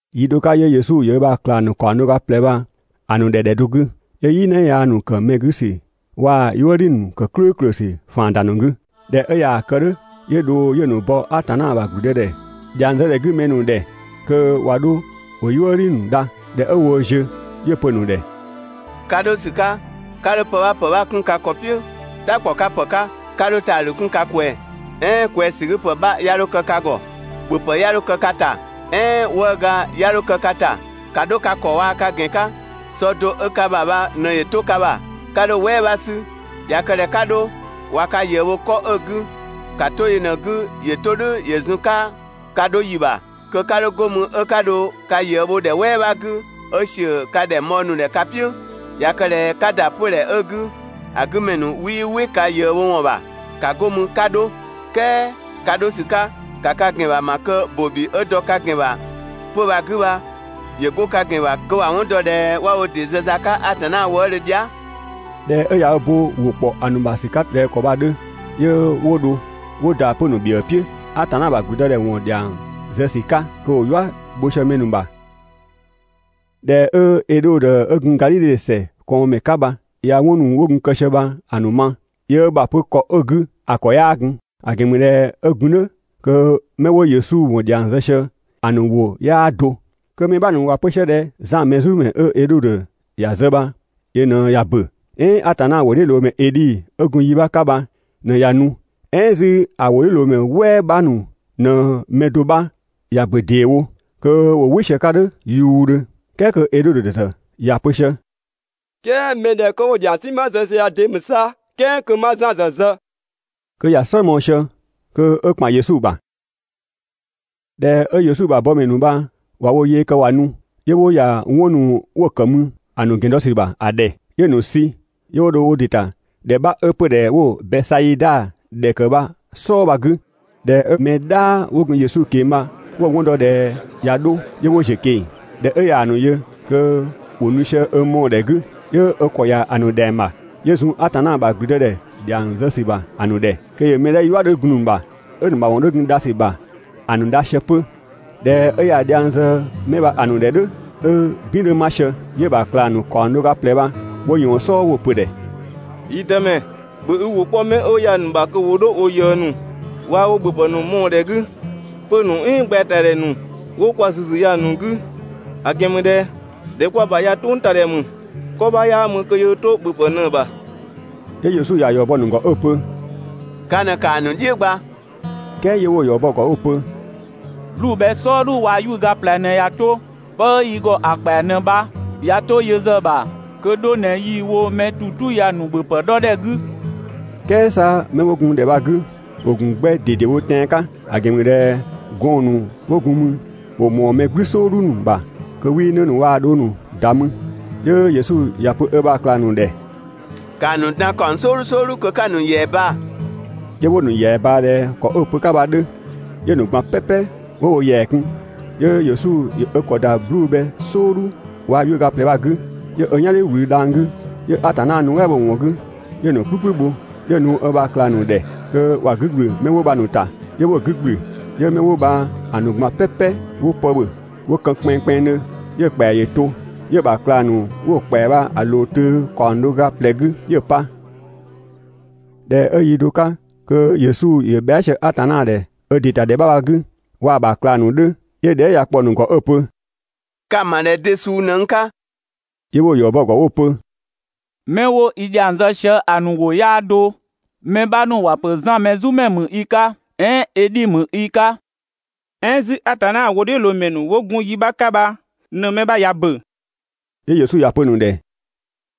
Yi do 'ka 'yö Yesu ‑yö ö ‑bha ꞊klang ‑nu ‑kaɔng do ga ꞊plɛ bha‑ ‑nu ‑dhɛ ‑dhɛ do 'gü, 'yö "yina yaa ‑nu ‑kë mɛ 'gü ‑sü waa‑ "yuëdhi ‑nu ‑kë "klʋ̈ʋ̈klʋ̈ ‑sü ‑faan ‑da ‑nu 'gü. ꞊Dhɛ 'ö ꞊yaa‑ kë "dhʋ̈, 'yö dho 'yö‑ ‑nu bɔ Atanna ‑bha ‑gblüdëdhɛ ‑dhiang zë ‑dhɛ 'gü mɛ ‑nu ‑dhɛ, kö ꞊wa 'dho ‑wo "yuëdhi ‑nu dha. ꞊Dhɛ 'ö woo ziö, 'yö‑ pö‑ ‑nu ‑dhɛ: «Ka 'dho ‑sü 'ka, 'ka 'dho pë 'bha ‑pë 'bha 'kun ka ‑kɔ "piʋ̈ "ta ‑kpɔ 'ka ‑pë 'ka, 'ka 'dho ‑taadhü 'kun ka ꞊kwɛɛ‑, "ɛɛn ꞊kwɛɛsügüpë 'bha 'ya 'dho kë ka ‑gɔ, ‑bhöpë 'ya 'dho kë ka ‑ta, "ɛɛn 'wëëga 'ya 'dho kë ka ‑ta. ‑Ka 'dho ka ‑kɔ 'waa ka ‑gɛn 'ka, sɔ do 'ö ka ‑bha bha ꞊në ‑yö 'to ka ‑bha, 'ka 'dho‑ "wɛɛ bha 'sü. ꞊Ya kë ꞊dhɛ 'ka 'dho, ꞊wa ka ꞊yëë bho 'kɔ 'ö‑ 'gü, ‑ka 'to yö ꞊në‑ 'gü kö ‑yö 'to "dhʋ̈ ‑yö zun‑ 'ka ka 'dho ‑yi ‑bha, kö 'ka 'dho 'go mü 'ö 'ka dho ka ꞊yëë bhɔ ‑dhɛ "wɛɛ 'bha 'gü ('ö ‑siö ka ‑dhɛng bhɔɔ ‑nu ‑dhɛ ka "piʋ̈). ꞊Ya kë ꞊dhɛ 'ka ‑da 'pödhɛ 'ö‑ 'gü, ‑a 'gü ‑mɛ ‑nu 'wii "wɩ ka ꞊yëë bho ‑wɔn ‑bha, ‑ka 'go mü kö 'ka 'dho. "Kɛɛ ka 'dho ‑sü 'ka, 'ka ka ‑gɛn ‑bha ‑ma kö ‑bobi 'ö dɔ ka ‑gɛn ‑bha 'pö‑ bha‑ 'gü bha, ‑yö 'go ka ‑gɛn ‑bha kö ‑wa 'wɔn dɔ ꞊dhɛ ('wa wo ‑dɩ zë za 'ka Atanna wëëdhö dhia").» ꞊Dhɛ 'ö ꞊ya ö bo ö ‑wʋ ‑kpɔ ‑a ‑nu ‑bha ‑sü 'ka ꞊dhɛ ‑kɔ bha‑ 'dhö, 'yö 'wo dho 'wo ‑da 'pö‑ ‑nu ‑bhiëë "piʋ̈, Atanna ‑bha ‑gblüdëdhɛ ‑wɔn ‑dhiang zë ‑sü 'ka, kö ‑wo "yua ‑nu bho sië mɛ ‑nu ‑bha. ꞊Dhɛ 'ö Edhodö 'ö gun Gadhidhe ‑sɛ ꞊kɔɔnmɛ 'ka bha ꞊ya 'wɔn ‑nu 'wo gun kë sië bha‑ ‑nu ma, yöö ö ‑bha pö ‑kɔ 'ö‑ 'gü ‑a ‑kɔ 'yaa gun, ‑a ‑gɛn ‑mü ꞊dhɛ 'ö gun "dhʋ̈ 'kö 'mɛ 'wo Yesu ‑wɔn ‑dhiang zë sië ‑a ‑nu ‑wʋ 'yaa do. Kö mɛ 'bha ‑nu ‑wa pö sië ꞊dhɛ Zan Mɛzumɛ 'ö Edhodö ‑ya zë bha ꞊në ꞊ya ‑bö, "ɛɛn Atanna ‑wʋdhiʋ̈loomɛ Edhi 'ö gun yi 'bha 'ka bha ꞊në ꞊ya nu, "ɛɛn 'zü ‑a ‑wʋdhiʋ̈loomɛ "wɛɛ 'bha ‑nu ꞊në‑ mɛ do 'bha ꞊ya ‑bö ‑deewo, (kö ‑wo "wɩ sië‑ 'ka "dhʋ̈ yuudhö). "Kɛɛ kö Edhodö ‑zë ‑ya pö sië: «"Kɛɛ mɛ 'dhɛ 'kö 'wo‑ ‑dhiang "sinma zë sië ya de ‑mü 'sa "kɛɛ kö 'ma Zan ‑zë zë?» Kö ‑ya "slë mɔɔ‑ sië kö 'ö ‑kpan Yesu ‑bha. ꞊Dhɛ 'ö Yesu ‑bha bɔmɛ ‑nu bha ꞊wa wo yee kë ꞊wa nu, 'yö 'wo ‑ya 'wɔn ‑nu 'wo‑ ‑kë mü ‑a ‑nu ‑gɛn dɔ ‑sü ‑bha ‑a ‑dhɛ. 'Yö‑ ‑nu sü, 'yö 'wo dho wo ‑dɩ ‑ta ‑dhɛ 'bha 'ö 'pödhɛ 'wo Bɛsaida ‑dhɛ ‑kë bha‑ "sɔɔ bha‑ 'gü. ꞊Dhɛ 'ö mɛ "dhaa 'wo gun Yesu ꞊keng‑ bha 'wo‑ 'wɔn dɔ ꞊dhɛ ꞊ya 'dho, 'yö 'wo ‑ziö ꞊keng‑. ꞊Dhɛ 'ö ꞊yaa‑ ‑nu yö kö ‑wo nu sië ö mɔɔ‑ ‑dhɛ 'gü, 'yö ö ‑kɔ ‑ya ‑a ‑nu ‑dhɛng ‑bha. 'Yö zun Atanna ‑bha ‑gblüdëdhɛ ‑dhiang zë ‑sü ‑bha ‑a ‑nu ‑dhɛ, kö ‑yö mɛ 'dhɛ "yua 'dhö gun‑ ‑nu ‑bha 'ö‑ ‑nu ‑mawɔn 'dhö gun dha ‑sü ‑bha ‑a ‑nu dha sië 'pö. ꞊Dhɛ 'ö ꞊ya dhiang zë 'mɛ bha‑ ‑nu ‑dhɛ "dhʋ̈, 'ö "bin 'dhö 'ma sië, 'yö‑ ‑bha ꞊klang ‑nu ‑kaɔng do ga ꞊plɛ bha 'wo ꞊yɔɔn‑ "sɔɔ 'wo‑ pö‑ ‑dhɛ: «Yi Dëmɛ, ‑bhö i ‑wʋ 'kpɔ 'mɛ 'wo ya‑ ‑nu ‑bha kö 'wo 'dho wo ꞊yëë ‑nu, waa‑ wo ‑bhöpë ‑nu mɔɔ‑ ‑dhɛ 'gü, 'pö‑ ‑nu "ɛɛn gbɛɛtadhɛ ‑nu 'wo kwa ‑züzü ya‑ ‑nu 'gü; ‑a ‑gɛn ‑mü ꞊dhɛ ‑dhɛ 'kwa‑ bha ya "tʋngtadhɛ ‑mü, 'kɔ 'bha 'yaa mü kö yöö 'to ‑bhöpë ꞊në‑ ‑bha. 'Yö Yesu ‑ya ‑yɔ bɔ‑ ‑nu ‑gɔ 'ö‑ pö: «Ka ꞊në ‑kaa ‑nu "dhiʋ̈ gba!» "Kɛɛ 'yö 'wo‑ ‑yɔ bɔ‑ ‑gɔ 'wo‑ pö: «'Bluu‑ bhɛ "sɔɔdhu waa‑ 'yuʋ̈ga ꞊plɛ ꞊në ꞊ya 'to, 'pë 'ö yi ‑gɔ ‑a ‑kpɛa ꞊në bha. ꞊Ya 'to yö ‑zë ‑bha kö 'dho ꞊në yii‑ wo mɛ ‑tu "tu ya‑ ‑nu ‑bhöpë 'dhɔ ‑dhɛ 'gü. "Kɛɛ 'sa 'mɛ 'wo gun ‑dhɛ bha‑ 'gü, ‑wo ‑gun 'gbɛ ꞊dedewo tɛan‑ 'ka, ‑a ‑gɛn ‑mü ꞊dhɛ gɔɔn‑ ‑nu 'wo gun mü ‑wo ‑mɔɔ mɛ "gblü "sɔɔdhu ‑nu ‑bha (kö 'wii 'në ‑nu waa‑ dhong ‑nu ‑da mü). 'Yö Yesu ‑ya pö ö ‑bha ꞊klang ‑nu ‑dhɛ: «‑Kaa ‑nu dan ‑kaɔng "sɔɔdhu "sɔɔdhu kö 'ka‑ ‑nu ‑yɛa baa‑.» 'Yö 'wo‑ ‑nu ‑yɛa ꞊baa ꞊dhɛ ‑kɔ 'ö‑ pö‑ 'ka bha‑ 'dhö, 'yö‑ ‑nu ꞊gban "pɛpɛ 'wo wo ‑yɛa kun. 'Yö Yesu ‑yö ö ‑kɔ ‑da 'bluu‑ bhɛ "sɔɔdhu waa‑ 'yuʋ̈ga ꞊plɛ bha‑ 'gü, 'yö ö "yan "dhiʋ̈ ‑wlü dhang‑ 'gü, 'yö Atanna nuɛ" bho‑ ‑wɔn 'gü, 'yö‑ ‑nu "kplü "kplü bho, 'yö‑ nu ö ‑bha ꞊klang ‑nu ‑dhɛ kö ‑wa 'gü ‑gblü 'mɛ 'wo bha‑ ‑nu ‑ta. 'Yö 'wo‑ 'gü ‑gblü, 'yö 'mɛ 'wo bha‑ ‑nu ꞊gban "pɛpɛ 'wo pë ‑bhö 'wo kën kpɛnngkpɛnngdhö, 'yö‑ ‑kpɛa ‑yö to, 'yö‑ ‑bha ꞊klang ‑nu 'wo‑ ‑kpɛa bha‑ ꞊loo töö ‑kaɔng do ga ꞊plɛ 'gü 'yö‑ pa. ꞊Dhɛ 'ö yi do 'ka kö Yesu ‑yö bhɛa" sië Atanna ‑dhɛ ö ‑dɩ ‑ta ‑dhɛ 'bha bha‑ 'gü waa‑ ‑bha ꞊klang ‑nu 'dhö, 'yö dhɛɛ" ya‑ kpɔ‑ ‑nu ‑gɔ 'ö‑ pö: «Ka‑ ‑ma ꞊dhɛ de suu ꞊në n 'ka?» 'Yö 'wo‑ ‑yɔ bɔ‑ ‑gɔ 'wo‑ pö: «('Mɛ 'wo i ‑dhiang zë sië) ‑a ‑nu ‑wʋ 'yaa do, mɛ 'bha ‑nu ‑wa ‑pö Zan Mɛzumɛ ‑mü i 'ka, "ɛɛn Edhi ‑mü i 'ka, "ɛɛn 'zü Atanna ‑wʋdhiʋ̈loomɛ ‑nu 'wo gun yi 'bha 'ka bha ꞊në‑ mɛ 'bha ꞊ya ‑bö.» 'Yö Yesu ‑ya pö‑ ‑nu ‑dhɛ: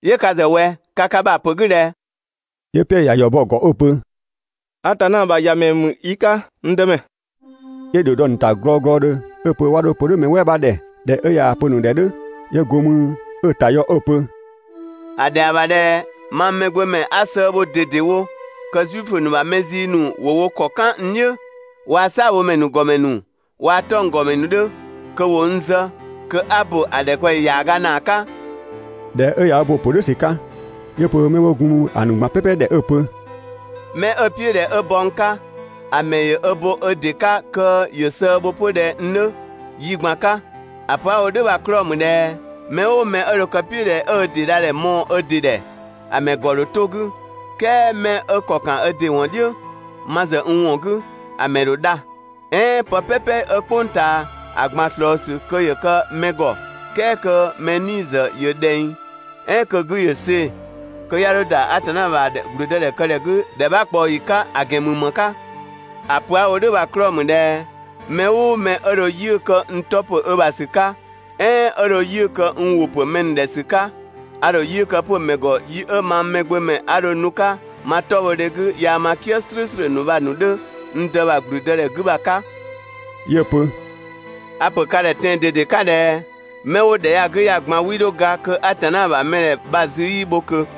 «'Yö ka ‑zë ꞊wɛ, ka ka ‑bha ‑pö 'gü ꞊dhɛ?» 'Yö Piɛdhö ‑ya ‑yɔ bɔ‑ ‑gɔ 'ö‑ pö: «Atanna ‑bha ‑Yamɛ ‑mü i 'ka, n Dëmɛ.» 'Yö ‑dhio dɔ‑ ‑nu ‑ta glɔɔglɔdhö 'ö‑ pö 'wa 'dho‑ pö "dhʋ̈ mɛ "wɛɛ 'bha ‑dhɛ. ꞊Dhɛ 'ö ꞊yaa‑ pö‑ ‑nu ‑dhɛ "dhʋ̈, 'yö go mü ö‑ ‑ta yɔ 'ö‑ pö: «‑A ‑dhɛa ‑bha ꞊dhɛ mang Mɛgbömɛ 'a sëë bho ꞊dedewo, kö Zuifö ‑nu ‑bha mɛ zii ‑nu ‑wo wo ‑kɔ "kan n "dhiʋ̈, waa‑ "saabhomɛ ‑nu ‑gɔmɛ ‑nu waa‑ 'tɔnggɔmɛ ‑nu 'dhö, kö ‑wo n zë, kö 'a ‑bö ‑a ‑dhɛkpaɔyi ‑yaaga ‑naa 'ka.» ꞊Dhɛ 'ö ꞊ya ö bo‑ ‑pö "dhʋ̈ ‑sü 'ka, 'yö‑ pö 'mɛ 'wo gun mü ‑a ‑nu ꞊gban "pɛpɛ ‑dhɛ 'ö‑ pö: «'Mɛ 'ö‑ "piʋ̈ ꞊dhɛ 'ö bɔ n 'ka, ‑a mɛ ‑yö ö bo ö ‑dɩ 'ka kö ‑yö sëë bho 'pö ꞊dhɛ n 'dhö yi ꞊gban 'ka. ‑A pö 'a‑ wo "dhʋ̈ bha‑ 'klɔɔ‑ ‑mü ꞊dhɛ mɛ "ʋʋ mɛ 'ö dho kë‑ "piʋ̈ ꞊dhɛ 'ö ö ‑dɩ dha ‑dhɛ mɔɔ‑ ö ‑dɩ ‑dhɛ, ‑a ‑mɛ ‑gɔ ‑dho 'to‑ 'gü, "kɛɛ mɛ 'ö ‑kɔ ‑kan ö ‑dɩ ‑wɔn "dhiʋ̈ ma ‑zë n ‑wɔn 'gü, ‑a ‑mɛ ‑dho dha. "Ɛɛn pë "pɛpɛ 'ö "kpʋng ꞊taa ‑a ꞊gban ꞊slɔɔ ‑sü kö ‑yö kë mɛ ‑gɔ, "kɛɛ kö‑ ‑mɛ 'nii‑ ‑zë ‑yö ꞊dhɛng, "ɛɛn kö‑ 'gü ‑yö see‑, ('kö 'ya 'dho ‑da Atanna ‑bha ‑gblüdëdhɛkëdhɛ 'gü ‑dhɛ 'bha ꞊kpaɔ ‑yi 'ka) ‑gɛn ‑mü ‑më 'ka? ‑A pö 'a‑ wo "dhʋ̈ bha‑ 'klɔɔ‑ ‑mü ꞊dhɛ 'mɛ "ʋʋ mɛ 'ö dho 'yiʋ̈‑ kë n 'tɔ ‑pö ö ‑bha ‑sü 'ka, "ɛɛn 'ö dho 'yiʋ̈‑ kë n ‑wʋ ‑pö mɛ ‑nu ‑dhɛ ‑sü 'ka, a ‑dho 'yiʋ̈‑ kë 'pö‑ ‑mɛ ‑gɔ yi 'ö mang Mɛgbömɛ 'a dho nu‑ 'ka ma 'tɔbhɔdhe 'gü yaa ma "kië "slʋ̈ʋ̈slʋ̈ ‑nu bha‑ ‑nu 'dhö n dë ‑bha ‑gblüdëdhɛ 'gü bha‑ 'ka.» 'Yö‑ pö: «A‑ ‑pö ka ‑dhɛ tɛan‑ ꞊dede 'ka ꞊dhɛ: Mɛ 'wo ‑dhɛ ya‑ 'gü ya‑ ꞊gban 'wii 'dho ga kö Atanna ‑bha mɛdhɛ bha‑ zü 'yii bho ꞊kö.»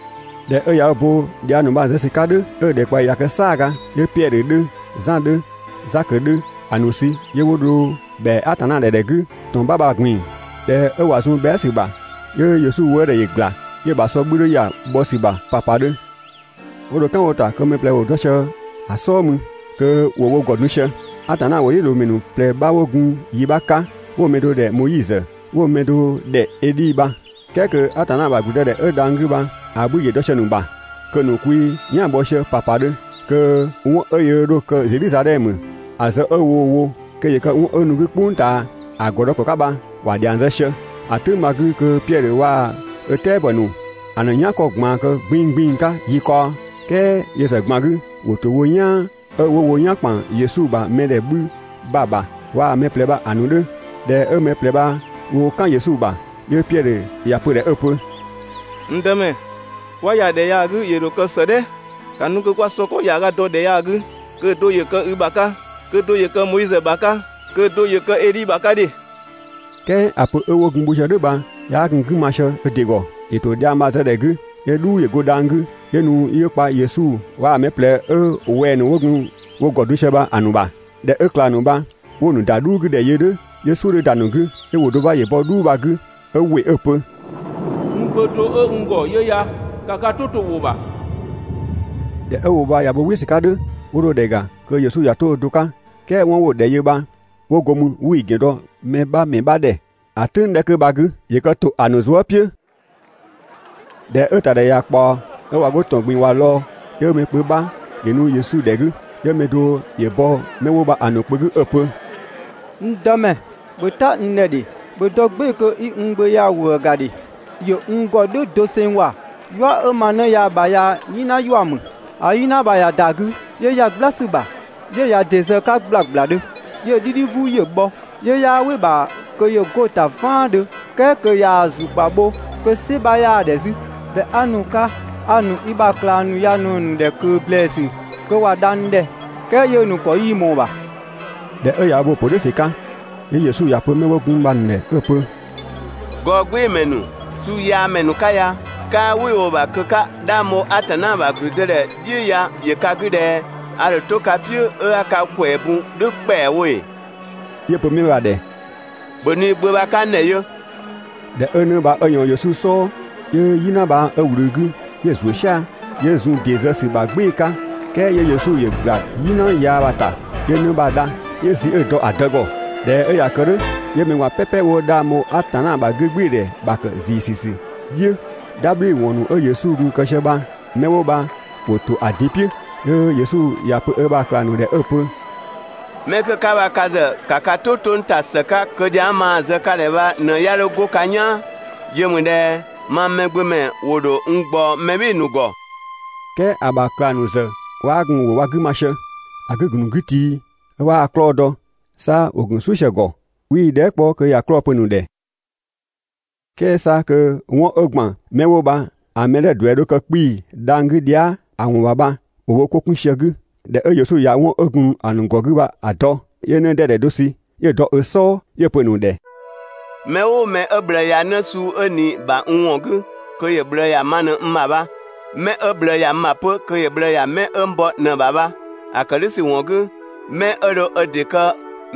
꞊Dhɛ 'ö ꞊ya ö bo dhiang ‑nu bha‑ zë ‑sü 'ka "dhʋ̈, 'ö ‑dhɛkpaɔyi ꞊ya kë "saaga, 'yö Piɛdhö 'dhö, Zan 'dhö, Zakö 'dhö ‑a ‑nu sü 'yö 'wo dho ‑bhɛa Atanna ‑dhɛ ‑dhɛ 'gü ‑tɔn 'bha bha‑ ꞊gbin‑. ꞊Dhɛ 'ö ꞊wa zun bhɛa" ‑sü ‑bha, 'yö Yesu wëëdhɛ ‑yö ‑gla, 'yö‑ ‑bha ‑sɔ 'bhü 'dhö ‑ya bhɔ ‑sü ‑bha ‑papadhö. 'Wo dho "kan wo ‑ta kö mɛ ꞊plɛ ‑wo dɔ sië‑ "sɔɔ mü kö ‑wo wo ‑gɔ dun sië. Atanna ‑wʋdhiʋ̈loomɛ ‑nu ꞊plɛ 'bha 'wo gun yi 'bha 'ka 'wo‑ mɛ do ‑dhɛ Moizö, 'wo‑ mɛ do ‑dhɛ Edhi bha. "Kɛɛ kö Atanna ‑bha ‑gblüdëdhɛ ö dhang‑ 'gü bha‑ 'bhü ‑yö dɔ sië‑ ‑nu ‑bha, kö‑ ‑nu kwi "yan‑ bhɔ sië ‑papadhö, kö 'wɔn 'ö yöö 'dho‑ kë Zedhizadhɛmö, ‑a zë 'ö woo‑ wo kö ‑yö kë 'wɔn 'ö nu‑ 'gü "kpʋng ꞊taa ‑a ‑gɔ dɔ ‑kɔ 'ka bha ‑wa ‑dhiang zë sië. ‑A "tʋ̈ng bha‑ 'gü kö Piɛdhö waa‑ ö "tɛabɔ ‑nu ‑a ‑nu "yankɔ ꞊gbaan kë 'gbin‑ 'gbin‑ 'ka yi kaɔ, "kɛɛ yö ‑zë ꞊gban 'gü, ‑wo ‑to wo "yaan 'ö 'wo wo "yan ‑kpan Yesu ‑bha mɛdhɛ 'bhü bha‑ ‑bha waa‑ mɛ ꞊plɛ bha‑ ‑nu 'dhö. ꞊Dhɛ 'ö mɛ ꞊plɛ bha woo "kan Yesu ‑bha, 'yö Piɛdhö ‑ya pö‑ ‑dhɛ 'ö‑ pö: «N Dëmɛ, 'kwa ‑ya ‑dhɛ ya‑ 'gü ‑yö ‑dho kë ‑së "dhɛ! ‑Ka nu kö 'kwa sɔ ‑kɔ ‑yaaga dɔ ‑dhɛ ya‑ 'gü kö ‑a do ‑yö kë i ‑bha 'ka, kö‑ do ‑yö kë Moizö ‑bha 'ka, kö‑ do ‑yö kë Edhi ‑bha 'ka ‑dhe!» "Kɛɛ ‑a pö 'ö gun wo sië "dhʋ̈ bha 'yaa gun‑ 'gü ma sië ö ‑dɩ ‑gɔ. ‑Yö ‑to dhiang bha‑ zë ‑dhɛ 'gü, 'yö "dhuu ‑yö go dhang‑ 'gü 'yö nu 'yö kpa Yesu waa‑ mɛ ꞊plɛ 'ö wɛng‑ ‑nu 'wo gun wo ‑gɔ dun sië bha‑ ‑nu ‑bha. ꞊Dhɛ 'ö ꞊klang ‑nu bha 'wo‑ ‑nu ‑da "dhuu 'gü ‑dhɛ yö "dhʋ̈, 'yö "suʋ̈ 'dhö ‑da ‑nu 'gü. 'Yö ‑wʋ do 'bha ‑yö bɔ "dhuu bha‑ 'gü 'ö ‑wɩ 'ö‑ pö: «N Gbö (do 'ö n ‑gɔ) 'yö ya, ‑ka ka "tʋ to‑ ‑wʋ ‑bha!» ꞊Dhɛ 'ö ‑wʋ bha ꞊ya bo "wɩ ‑sü 'ka "dhʋ̈, 'wo dho ‑dhɛ ‑ga kö Yesu ꞊ya 'to ö do 'ka. "Kɛɛ 'wɔn 'wo‑ ‑dhɛ yö bha 'wo go mü 'wii‑ ‑gɛn dɔ mɛ 'bha ‑mɛ 'bha ‑dhɛ ‑a "tʋ̈ng 'dhɛ kö bha‑ 'gü, (‑yö kë ‑to ‑a ‑nu zuë" "piʋ̈). ꞊Dhɛ 'ö‑ ‑ta ‑dhɛ ꞊ya ꞊kpaɔ, 'ö ꞊wa 'go ‑tɔn ꞊gbin‑ ꞊wa lɔɔ‑, 'yö mɛ kpö 'bha ‑yö nu Yesu ‑dhɛ 'gü. 'Yö mɛ do ‑yö bɔ 'mɛ 'wo bha‑ ‑nu kpö 'gü 'ö‑ pö: «N Dëmɛ, ‑bhö "ta n ‑dhɛ ‑dhe! ‑Bhö dɔ "gbɩɩ‑ kö 'i n gbö ya‑ ‑wëë ‑ga ‑dhe! ‑Yö n ‑gɔ "dhʋ̈ doseng ‑wa, "yua 'ö ma 'në ya‑ ‑bha ya "yina ‑yua ‑mü. ‑A "yina bha ꞊ya ‑da 'gü, 'yö ‑ya "gbla ‑sü ‑bha, 'yö ꞊ya ‑dɩ zë‑ 'ka ‑gblagbladhö. 'Yö‑ "dhidhi "vuu ‑yö bhɔ, 'yö 'yaa "wɩ‑ ‑bha kö ‑yö 'go‑ ‑ta "vaandhö "kɛɛ kö ꞊yaa‑ ‑zlukpa bho kö "sɩ 'bha 'yaa‑ ‑dhɛ 'zü. ꞊Dhɛ 'a nu‑ 'ka, a‑ ‑nu i ‑bha ꞊klang ‑nu ya ꞊në‑ ‑nu ‑dhɛ ꞊kö ‑blɛɛsü kö ‑wa dha n ‑dhɛ, "kɛɛ 'yö‑ ‑nu ‑kɔ 'yii ꞊mɔɔ‑ ‑bha.» ꞊Dhɛ 'ö ꞊ya ö bo‑ ‑pö "dhʋ̈ ‑sü 'ka, 'yö Yesu ‑ya pö 'mɛ 'wo gun mü bha‑ ‑nu ‑dhɛ 'ö‑ pö: «Gɔɔgbɩɩmɛ ‑nu, suuyaamɛ ‑nu 'ka ya, 'kaa "wɩ 'ö‑ wo‑ ‑bha kö 'ka 'dhang bho Atanna ‑bha 'gügbɩɩdhɛ "dhiʋ̈ ya ‑yö ka 'gü ꞊dhɛ a ‑dho 'to ka "piʋ̈ 'ö 'a ka ‑kwɛɛ bun "dhʋ̈ ‑kpɛawo ‑ee?» 'Yö‑ pö 'mɛ bha‑ ‑dhɛ: «‑Bhö nu i gbö bha‑ 'ka n ‑dhɛ yö!» ꞊Dhɛ 'ö 'në bha 'ö ꞊yɔɔn Yesu "sɔɔ, 'yö "yina bha 'ö ꞊wlü‑ 'gü, 'yö‑ ‑zuö "sia‑, 'yö zun ‑dɩ zë ‑sü ‑bha "gbɩɩ‑ 'ka, "kɛɛ 'yö Yesu ‑yö ꞊gbla "yina yaa bha‑ ‑ta, 'yö 'në bha‑ dha, 'yö‑ sü 'ö‑ dɔ‑ dë ‑gɔ. ꞊Dhɛ 'ö ꞊ya kë "dhʋ̈, 'yö mɛ ꞊gban "pɛpɛ 'wo 'dhang bho Atanna ‑bha 'gügbɩɩdhɛ ‑bha ‑kë ‑ziisü ‑sü "dhiʋ̈. "Dhabhliwɔn ‑nu 'ö Yesu gun kë sië bha, 'mɛ 'wo bha ‑wo ‑to ‑a din "piʋ̈, 'yö Yesu ‑ya pö ö ‑bha ꞊klang ‑nu ‑dhɛ 'ö‑ pö: «'Mɛ 'kö 'ka bha ka ‑zë, ‑ka ka "tʋ 'to n ‑ta ‑së 'ka kö dhiang 'ö maa‑ zë ka ‑dhɛ bha ꞊në 'ya 'dho 'go ka "yaan. Yö ‑mü ꞊dhɛ mang Mɛgbömɛ ‑wo ‑dho n ꞊gbaɔ mɛ "bhɩɩ‑ ‑nu ‑gɔ, "kɛɛ ‑a ‑bha ꞊klang ‑nu ‑zë 'waa gun ‑wʋ bha‑ 'gü ma sië, ‑a 'gü‑ ‑gun ‑nu 'gü tii, 'ö 'waa‑ 'klɔɔ‑ dɔ. 'Sa ‑wo gun "suʋ̈ sië‑ ‑gɔ, 'wii‑ dhɛɛ" 'kpɔ kö ‑ya 'klɔɔ‑ pö‑ ‑nu ‑dhɛ. "Kɛɛ 'sa kö 'wɔn 'ö ‑gban 'mɛ 'wo bha‑ mɛ 'dhɛ 'ö‑ ‑duɛ dho kë 'kpii‑ dhang‑ 'gü dhia" ‑a ‑wɔn ‑bha bha ‑wo wo 'ko 'kun sië‑ 'gü. ꞊Dhɛ 'ö Yesu ꞊ya 'wɔn 'ö gun‑ ‑nu ‑gɔ 'gü bha‑ dɔ, 'yö 'në 'dɛdɛ do sü 'yö‑ dɔ ö "sɔɔ, 'yö‑ pö‑ ‑nu ‑dhɛ: «Mɛ "ʋʋ mɛ 'ö ꞊bhlëë ‑ya 'në suu 'ö ꞊ni‑ ‑bha n ‑wɔn 'gü kö ‑yö ꞊bhlëë ‑ya ma ꞊në n ‑bha bha. 'Mɛ 'ö n ꞊bhlëë ‑ya 'pö kö ‑yö ꞊bhlëë ‑ya 'mɛ 'ö n bɔ ꞊në‑ ‑bha bha. ‑A ‑kë "dhʋ̈ ‑sü ‑wɔn 'gü, 'mɛ 'ö dho ö ‑dɩ kë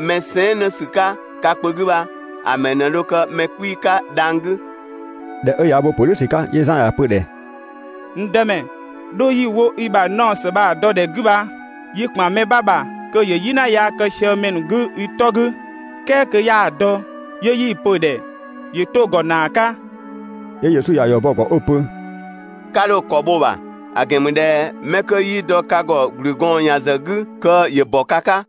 mɛ sɛɛn" 'nësü 'ka ka kpö 'gü bha, ‑a ‑mɛ ꞊në dho kë mɛ 'kpii‑ 'ka dhang‑ 'gü. ꞊Dhɛ 'ö ꞊ya ö bo‑ ‑pö "dhʋ̈ ‑sü 'ka, 'yö Zan ‑ya pö‑ ‑dhɛ: «N Dëmɛ, 'dho 'yi‑ wo i ‑bha naɔ ‑së bha‑ dɔ ‑dhɛ 'gü bha yi ‑kpan mɛ 'bha ‑bha kö ‑yö "yina yaa kë sië mɛ ‑nu 'gü i 'tɔ 'gü, "kɛɛ kö 'yaa‑ dɔ, 'yö 'yi‑ pö‑ ‑dhɛ ‑yö 'to‑ ‑gɔ ‑naa 'ka.» 'Yö Yesu ‑ya ‑yɔ bɔ‑ ‑gɔ 'ö‑ pö: «'Ka 'dho‑ ‑kɔ bho‑ ‑bha, ‑a ‑gɛn ‑mü ꞊dhɛ 'mɛ 'kö 'yii dɔ ka ‑gɔ ‑gblü gɔɔn ‑yan ‑zë 'gü kö ‑yö ‑bɔ ka 'ka.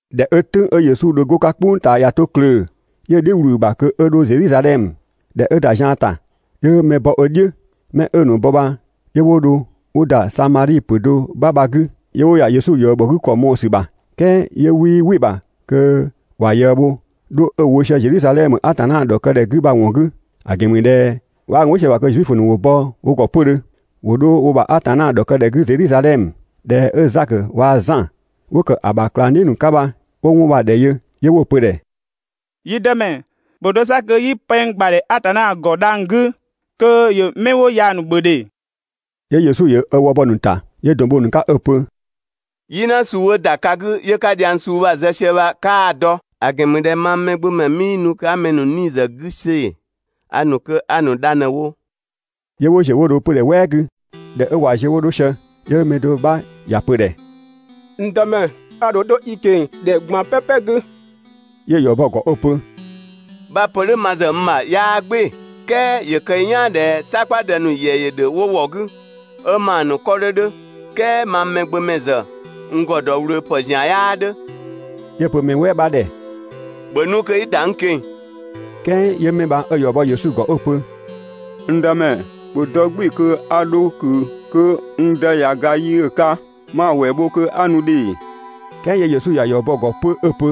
꞊Dhɛ 'ö "tʋ̈ng 'ö Yesu dho 'go‑ 'ka "kpʋng ꞊taa ꞊ya 'to klöö‑, 'yö‑ "dhiʋ̈ ꞊wlü‑ ‑bha kö 'ö 'dho Zedhizadhɛmö. ꞊Dhɛ 'ö ‑da zian ‑ta, 'yö mɛ bɔ ö "dhiʋ̈. 'Mɛ 'ö‑ ‑nu bɔ bha 'yö 'wo dho 'wo ‑da Samadhi ‑pö do 'bha bha‑ 'gü, 'yö 'wo ‑ya Yesu ꞊yëë bhɔ 'gü ‑kɔ mɔɔ‑ ‑sü ‑bha. "Kɛɛ 'yö 'wii "wɩ‑ ‑bha kö ‑wa ꞊yëë bho 'dho 'ö‑ wo sië Zedhizadhɛmö Atanna ‑dhɔkëdhɛ 'gü bha‑ ‑wɔn 'gü (‑a ‑gɛn ‑mü ꞊dhɛ 'waa gun "wɩ sië‑ ‑bha kö Zuifö ‑nu ‑wo bɔ wo ‑gɔ 'pödhö ‑wo 'dho wo ‑bha Atanna ‑dhɔkëdhɛ 'gü Zedhizadhɛmö). ꞊Dhɛ 'ö Zakö waa‑ Zan 'wo ‑kë ‑a ‑bha ꞊klangdhiʋ̈ ‑nu 'ka bha, 'wo 'wɔn bha‑ ‑dhɛ yö, 'yö 'wo‑ pö‑ ‑dhɛ: «Yi Dëmɛ, ‑bhö dɔ 'sa kö 'yi pɛng ‑gbadhɛ Atanna ‑gɔ dhang‑ 'gü kö ‑yö 'mɛ 'wo ya‑ ‑nu ‑bhö ‑dhe!» 'Yö Yesu ‑yö ö wë bɔ‑ ‑nu ‑ta, 'yö ‑dɔn bho‑ ‑nu 'ka ['ö‑ pö: «"Yina suu 'ö ‑da ka 'gü 'yö 'ka dhiang suu bha‑ zë sië bha 'kaa‑ dɔ; ‑a ‑gɛn ‑mü ꞊dhɛ mang Mɛgbömɛ 'mii nu kö 'a mɛ ‑nu 'nii‑ zë 'gü see‑, a ‑nu kö 'a‑ ‑nu dha ꞊në‑ wo.] 'Yö 'wo ‑ziö 'wo dho 'pödhɛ "wɛɛ 'gü. ꞊Dhɛ 'ö ꞊wa ziö 'wo 'dho sië, 'yö mɛ do 'bha ‑ya pö‑ ‑dhɛ: «N Dëmɛ, a ‑dho 'dho i ꞊keng‑ ‑dhɛ ꞊gban "pɛpɛ 'gü.» 'Yö‑ ‑yɔ bɔ‑ ‑gɔ 'ö‑ pö: «('Bha‑ pö "dhʋ̈ ma ‑zë n ‑bha 'yaa "gbɩɩ‑ "kɛɛ) ‑yö kë i "yaan ꞊dhɛ "sakpadë ‑nu ‑yɛ ‑dhö 'wo ‑wɔ 'gü, 'ö ‑maa ‑nu 'kɔ 'dhö 'dhö, "kɛɛ mang Mɛgbömɛ ‑zë, n ‑gɔ ‑dɔ ꞊wlöö ‑pë ‑zian 'yaa 'dhö.» 'Yö‑ pö mɛ "wɛɛ 'bha ‑dhɛ: «‑Bhö nu kö 'i ‑da n ꞊keng‑!» "Kɛɛ 'yö 'mɛ bha 'ö‑ ‑yɔ bɔ Yesu ‑gɔ 'ö‑ pö: «N Dëmɛ, ‑bhö dɔ "gbɩɩ‑ kö 'a 'dho ꞊kö kö n dë ꞊ya ga yi 'ö‑ 'ka 'ma‑ ‑wɛɛ bho kö 'a nu ‑dhe!» "Kɛɛ 'yö Yesu ‑ya ‑yɔ bɔ‑ ‑gɔ 'pö 'ö‑ pö: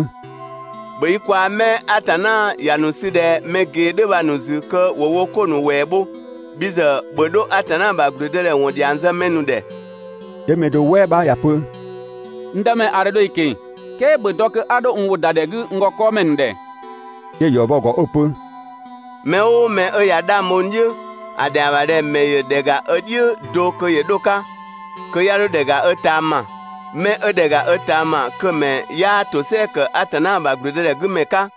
«‑Bhö i kwaa‑ 'mɛ Atanna ‑ya ‑nu sü ꞊dhɛ mɛ ꞊gee 'dhö bha‑ ‑nu ‑zü kö ‑wo wo 'ko ‑nu ‑wɛɛ bho, bhi ‑zë, ‑bhö 'dho Atanna ‑bha ‑gblüdëdhɛ ‑wɔn ‑dhiang zë mɛ ‑nu ‑dhɛ.» 'Yö mɛ do "wɛɛ 'bha ‑ya pö: «N Dëmɛ, a ‑dho 'dho i ꞊keng‑, "kɛɛ ‑bhö dɔ kö 'a 'dho n ‑wʋ ‑da ‑dhɛ 'gü n ‑gɔ 'kɔɔmɛ ‑nu ‑dhɛ.» 'Yö‑ ‑yɔ bɔ‑ ‑gɔ 'ö‑ pö: «Mɛ "ʋʋ mɛ 'ö ꞊ya 'dhang bho n "dhiʋ̈, ‑a ‑dhɛa ‑bha ꞊dhɛ‑ ‑mɛ ‑yö ‑dhɛ ‑ga ö "dhiʋ̈ do kö ‑yö 'dho‑ 'ka, kö 'ya 'dho ‑dhɛ ‑ga ö ꞊taama, 'mɛ 'ö ‑dhɛ ‑ga ö ꞊taama kö‑ ‑mɛ 'yaa ‑tosɛa ‑kë Atanna ‑bha ‑gblüdëdhɛ 'gü ‑mɛ 'ka.»